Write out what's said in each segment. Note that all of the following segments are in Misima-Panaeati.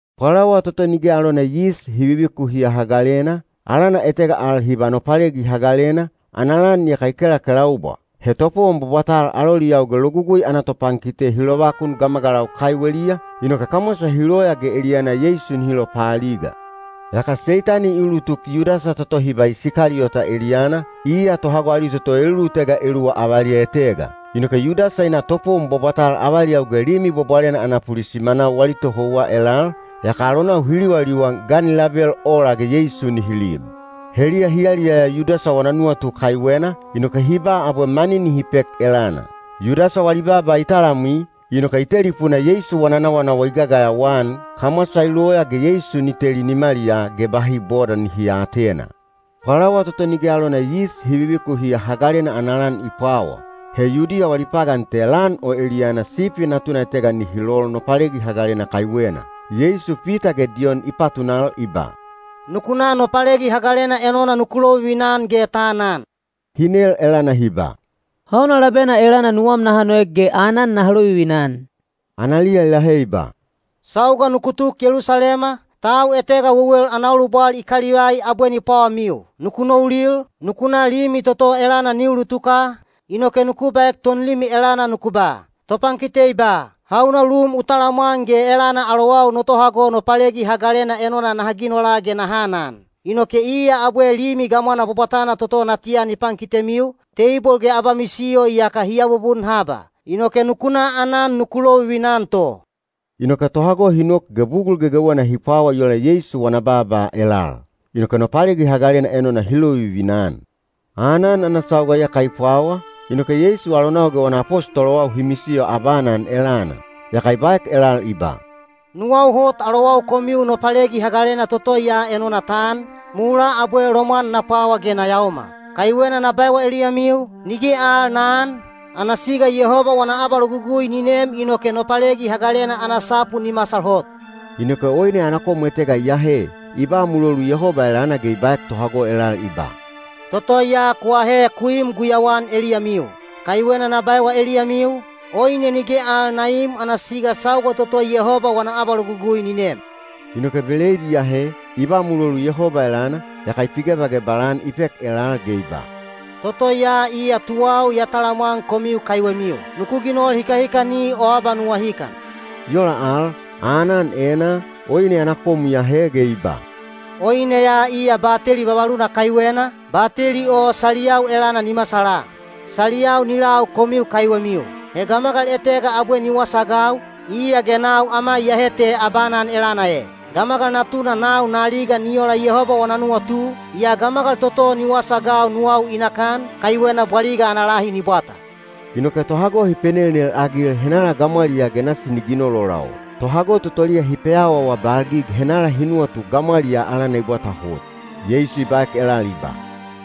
Pwalawa toto Nige alona Yis Hi Vivikuhiya Hagalena, alana etega al hi ba Nopalegi Hagalena, ana lan iyaka i kelakelaubwa. He topowon bwabwatal aloliyau ge Logugui ana topankite hi lovakun gamagalau kaiweliya, inoke kamwasa hi loya ge eliyana Yeisu nihi lopaaliga. Yaka Seitani i ulutuk Yudasa toto hi ba Isikaliyota eliyana, iya tohago ali toto elulutega eluwa avaliya etega. Inoke Yudasa i na topowon bwabwatal avaliyau ge Limi Bwabwalena ana pulisimanau wali tohouwa elal, yaka alonau hi liwaliwan ga ni label ola ge Yeisu nihi lib. Heliya hi yaliyaya Yudasa wana nuwatu kaiwena, inoke hi ba abwe mani nihi pek elana. Yudasa wali baaba i talamwi, inoke i telipuna Yeisu wana nawanawa i gagayawa-an, kamwasa i loya ge Yeisu ni teli nimaliyaa ge bahi boda nihi aatena. Pwalawa toto Nige alona Yis Hi Vivikuhiya Hagalena ana lan i pwawa. He Yudiya wali pagan te lan o eliyana sipi natuna etega nihi lol Nopalegi Hagalena kaiwena. Yeisu Pita ge Diyon i patunal i ba, “Nuku na Nopalegi Hagalena enona nuku lovivina-an ge ta anan.” Hi nel elana hi ba, “Hauna labena elana nuwam naha noek ge aanan naha lovivina-an?” Analiya i lahe i ba, “Sauga nuku tuk Yelusalema, tau etega wewel ana ulubwal i kalivai abwe ni pwawamiu. Nuku noulil, nuku na limi toto elana ni ulutuka, inoke nuku baek tonlimi elana nuku ba, ‘Topankite i ba: Hauna lum u talamwan ge elana alowau no tohago Nopalegi Hagalena enona naha ginola ge naha anan?’ Inoke iya abwe limi gamwana bwabwatana toto natiya ni pankitemiu, teibol ge abamisiyo iyaka hi abubun haba. Inoke nuku na aanan nuku lovivina-an to.” Inoke tohago hi nok ge bugul gegewena hi pwawa i ola Yeisu wana baaba elal. Inoke Nopalegi Hagalena enona hi lovivina-an. Aanan ana sauga iyaka i pwawa, inoke Yeisu alonau ge wana apostolowau hi misiyo abaanan elana. Yaka i baek elal i ba, “Nuwau hot alowau komiu Nopalegi Hagalena toto ya enona ta an, mulaa abwe lomwan na pwawa ge na yaomal. Kaiwena na baewa eliyamiu, nige al na aan, ana siga Yehoba wana abalogugui ni nem inoke Nopalegi Hagalena ana sapu ni masal hot.” Inoke oine ana kom etega i ahe, i ba mulolu Yehoba elana ge i baek tohago elal i ba, “Toto ya ku ahe ku im guyauan eliyamiu. Kaiwena na baewa eliyamiu, oine nige al na iim ana siga sauga toto Yehoba wana abalogugui ni nem.” Inoke beleid i ahe, i ba mulolu Yehoba elana, yaka i pigebagebal-an i pek elal ge i ba, “Toto ya iya tuwau ya talamwan komiu kaiwemiu. Nuku ginol hikahikani o abanuwahikan.” I ola al, aanan enaa, oine ana kom i ahe ge i ba, “Oine ya iya bateli vavaluna kaiwena, bateli o saliyau elana ni masala. Saliyau ni lau komiu kaiwemiu. “He gamagal etega abwe ni wasaagau, iya ge nau ama iyehe te abaanan elana e. Gamagal Natuna nau na aliga ni ola Yehoba wana nuwatu, yaa gamagal toto ni wasaagau nuwau i nakan, kaiwena bwaliga ana lahi ni bwata.” Inoke tohago hi penelnel-agil henala gamwaliyaa ge nasi ni ginol ola o. Tohago totoliya hi peawaawabalgig henala hi nuwatu gamwaliyaa alana i bwata hot. Yeisu i baek elal i ba,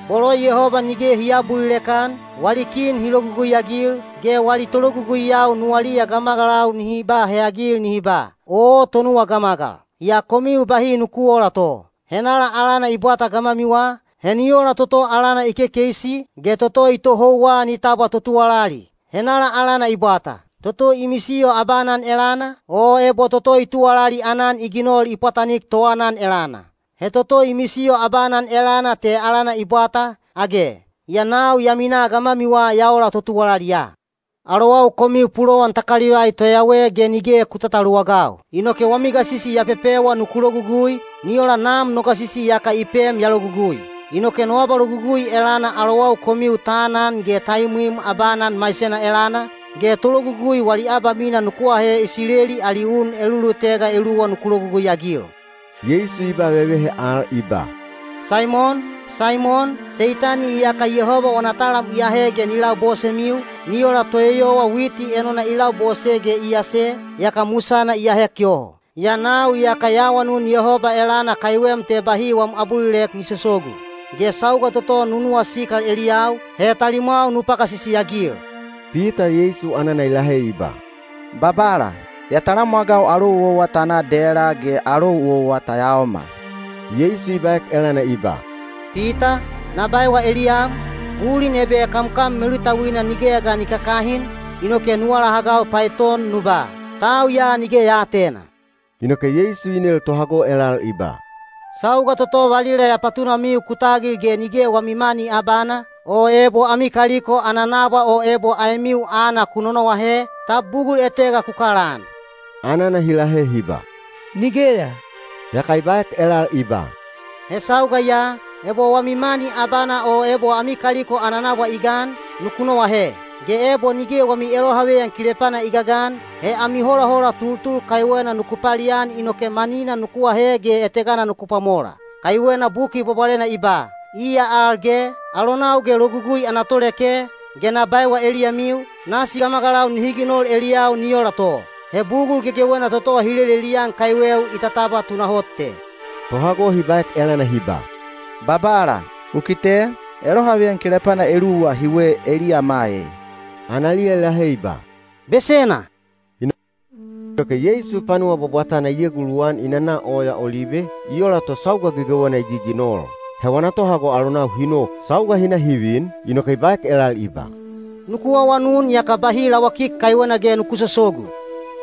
“Bolo Yehoba nige hi aabulilek-an, wali kin hi logugui-agil, ge wali tologuguiyau nuwaliya gamagalau nihi ba heyagil nihi ba, ‘Oo, tonuwa gamagal!’ Yaa komiu bahi nuku oola to. Henala alana i bwata gamwamiwa, he ni ola toto alana i kekeisi, ge toto i tohouwa ni tabwa totuwalali. Henala alana i bwata? Toto i misiyo abaanan elana, o ebo toto i tuwalali aanan i ginol i pwatanik toaanan elana? He toto i misiyo abaanan elana te alana i bwata, age? Yaa nau ya minaa gamwamiwa ya ola totuwalali ya. “Alowau komiu pulowan ta kalivai toyawe ge nige ku tataluwagau. Inoke wami gasisi ya pepewa nuku logugui, ni ola Nam no gasisi iyaka i pem ya logugui. Inoke no abalogugui elana alowau komiu ta anan ge ta imwim abaanan maisena elana, ge tologugui wali abamina nuku ahe Isileli ali un elulutega eluwa nuku logugui-agil.” Yeisu i ba vevehe al i ba, “Saimon! Saimon! Seitani iyaka Yehoba wana talam i ahe ge ni labosemiu, ni ola toeyowa witi enona i labose ge i ase, yaka musana i ahek yoho. Yaa nau iyaka ya awanun Yehoba elana kaiwem te bahi wam abulilek ni sosogu. Ge sauga toto nu nuwasikal eliyau, he talimwau nu pagasisi-agil.” Pita Yeisu anana i lahe i ba, “Babala, ya talamwagau alou owa ta na dela ge alou owa ta yaomal.” Yeisu i baek elana i ba, “Pita, na baewa eliyam, bulin ebe kamkam melutauina nigeya ga ni kakahin, inoke nu alahagau paeton nu ba, ‘Tau ya nige ya aatena.’” Inoke Yeisu i nel tohago elal i ba, “Sauga toto valila ya patunamiu ku tagil ge nige wami mani abana, o ebo ami kaliko ana nabwa o ebo aemiu aana ku nonoahe, tab bugul etega ku kalaan?” Anana hi lahe hi ba, “Nigeya.” Yaka i baek elal i ba, “He sauga ya, ebo wami mani abana o ebo ami kaliko ana nabwa i gan, nuku noahe. Ge ebo nige wami elohaveyan kilepana i gagan, he ami holahola tultul kaiwena nuku palian inoke manina nuku ahe ge etegana nuku pwamola. Kaiwena Buki Bwabwalena i ba, ‘Iya al ge, alonau ge logugui ana toleke,’ ge na baewa eliyamiu, nasi gamagalau nihi ginol eliyau ni ola to. He bugul gegewena toto hi lelelian kaiweu i tatabwa tunahot te.” Tohago hi baek elana hi ba, “Babala, u kite, elohaveyan kilepana eluwa hiwe eliyama e.” Analiya i lahe i ba, “Besena!” Inoke Yeisu panuwa bwabwatana i eguluwan i nana Oya Olibe, i ola to sauga gegewena i giginol. He wana tohago alonau hi nok. Sauga hi na hi vin, inoke i baek elal i ba, “Nuku awanun yaka bahi lawakik kaiwena ge nuku sosogu.”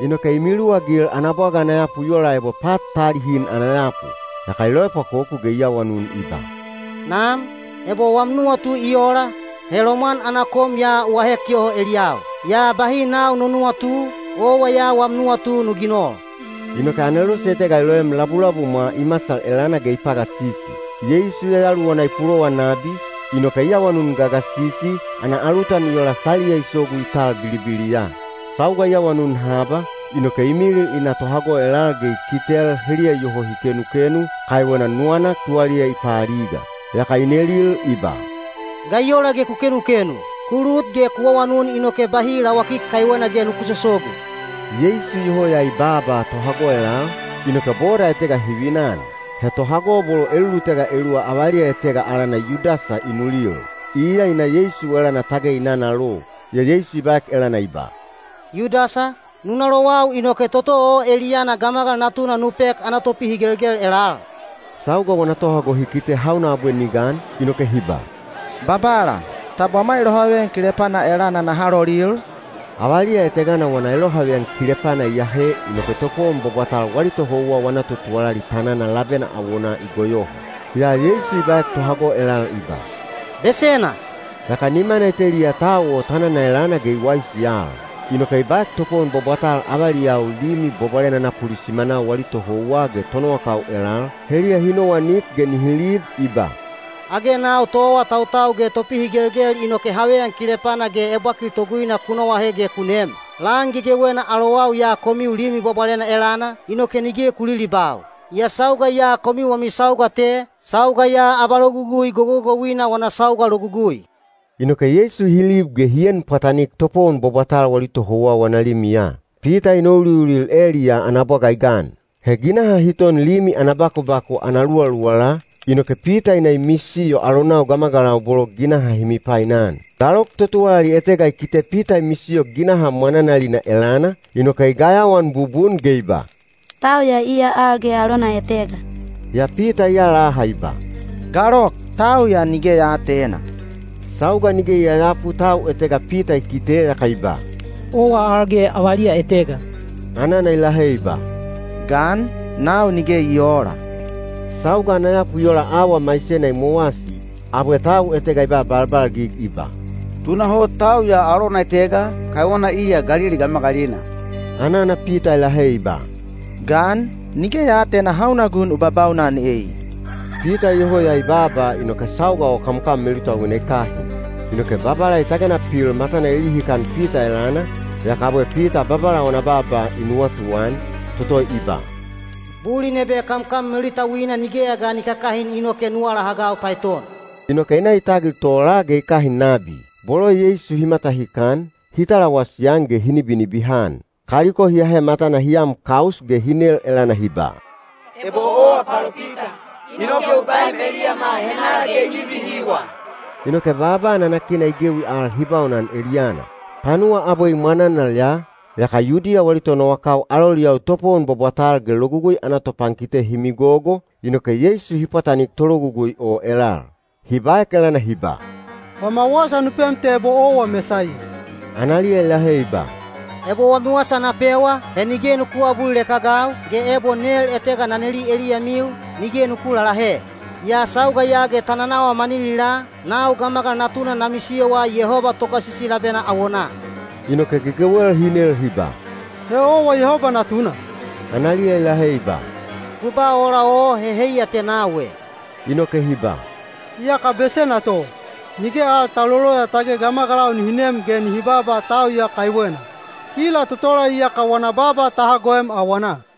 Inoke i miluwagil ana bwaga ana yapu i ola ebo pat ta alihin ana yapu. Yaka i loepwakoku ge i awanun i ba, “Nam, ebo wam nuwatu i ola, he lomwan ana kom ya u ahek yoho eliyau. Yaa bahi nau no nuwatu, owa ya wam nuwatu nu ginol.” Inoke anelose etega i loem labulabumwa i masal elana ge i pagasisi. Yeisu yayaluwana i pulowan nabi, inoke i awanun gagasisi, ana alutan i ola saliya i sogu i tal bilibiliya. Sauga i awanun haba, inoke i milil i na tohago elal ge i kitel heliya iyoho hi kenukenu, kaiwena nuwanak tuwaliya i paaliga. Yaka i nelil i ba, “Ga i ola ge ku kenukenu? Ku lut ge ku awanun inoke bahi lawakik kaiwena ge nuku sosogu.” Yeisu iyoho ya i baaba tohago elal, inoke boda etega hi vinan. He tohago bolo elulutega eluwa avaliya etega alana Yudasa i nulil. Iya i na Yeisu elana tage i nanalo. Yaa Yeisu i baek elana i ba, “Yudasa, nu nalowau inoke toto o eliyana Gamagal Natuna nu pek ana topihigelgel elal?” Sauga wana tohago hi kite hauna abwe ni gan, inoke hi ba, “Babala, tab wama elohaveyan kilepana elana naha lolil?” Avaliya etegana wana elohaveyan kilepana i ahe inoke topowon bwabwatal wali tohouwa wana totuwalali tanana labena awonaa i goyoho. Yaa Yeisu i baek tohago elal i ba, “Besena!” Yaka nimana i teliya tau o tanana elana ge i waisi al. Inoke i baek topowon bwabwatal avaliyau Limi Bwabwalena ana pulisimanau wali tohouwa ge tonowakau elal, heliya hi nowanik ge nihi lib, i ba, “Age nau toawatautau ge topihigelgel inoke haveyan kilepana ge ebwakil toguina ku noahe ge ku nem? Lan gegewena alowau ya komiu Limi Bwabwalena elana, inoke nige ku lilibau. Yaa sauga ya komiu wami sauga te, sauga ya abalogugui gogogouina wana sauga logugui.” Inoke Yeisu hi lib ge hi en pwatanik topowon bwabwatal wali tohouwa wana limiya. Pita i nouliulil eliyaa ana bwaga i gan. He ginaha hi ton limi ana bakubaku ana luwaluwala, inoke Pita i na i misiyo alonau gamagalau bolo ginaha hi mipainan. Galok totuwalali etega i kite Pita i misiyo ginaha mwananalina elana, inoke i gayawaan bubun ge i ba, “Tau ya iya al ge alona etega.” Yaa Pita i alaha i ba, “Galok, tau ya nige ya aatena.” Sauga nige i yayapu tau etega Pita i kite yaka i ba, “Owa al ge avaliya etega.” Anana i lahe i ba, “Gan, nau nige i oola.” Sauga ana yapu i ola auwa maisena i mowasi, abwe tau etega i ba balbalgig i ba, “Tunahot tau ya alona etega, kaiwena iya Galili gamagalina.” Anana Pita i lahe i ba, “Gan, nige ya aatena hauna gun u babaunan ei.” Pita iyoho ya i baaba inoke sauga o kamkam melutauina i kahin. Inoke Babala i tagena pil matana i lihikan Pita elana, yaka abwe Pita Babala wana baaba i nuwatuan, toto i ba, “Bulin ebe kamkam melutauina nigeya ga ni kakahin inoke nu alahagau paeton.” Inoke i na i tagil tola ge i kahin nabi. Bolo Yeisu hi matahikan, hi talawasi-an ge hi nibinibihan. Kaliko hi ahe matana hi am kaus ge hi nel elana hi ba, “Ebo owa palopita, inoke u baem eliyama henala ge i nibihiwa?” Inoke baaba nanakina i gewi al hi baunan eliyana. Panuwa abwe i mwananal ya, yaka Yudiya wali tonowakau aloliyau topowon bwabwatal ge Logugui ana topankite hi migogo, inoke Yeisu hi pwatanik tologugui o elal. Hi baek elana hi ba, “Wama wasa nu pem te ebo owa Mesaiya.” Analiya i lahe i ba, “Ebo wami wasa na pewa, he nige nuku aabulilek-agau, ge ebo nel etega na neli eliyamiu, nige nuku lalahe. Yaa sauga ya ge ta nanawa maninilaa, nau Gamagal Natuna na misiyowa Yehoba Togasisi labena awonaa.” Inoke gegewel hi nel hi ba, “He owa Yehoba Natuna?” Analiya i lahe i ba, “Ku ba ola o he heiya te nau e.” Inoke hi ba, “Iyaka besena to. Nige al ta loloya tage gamagalau nihi nem ge nihi baaba tau ya kaiwena. Kila totola iyaka wana baaba ta hagoem awanaa.”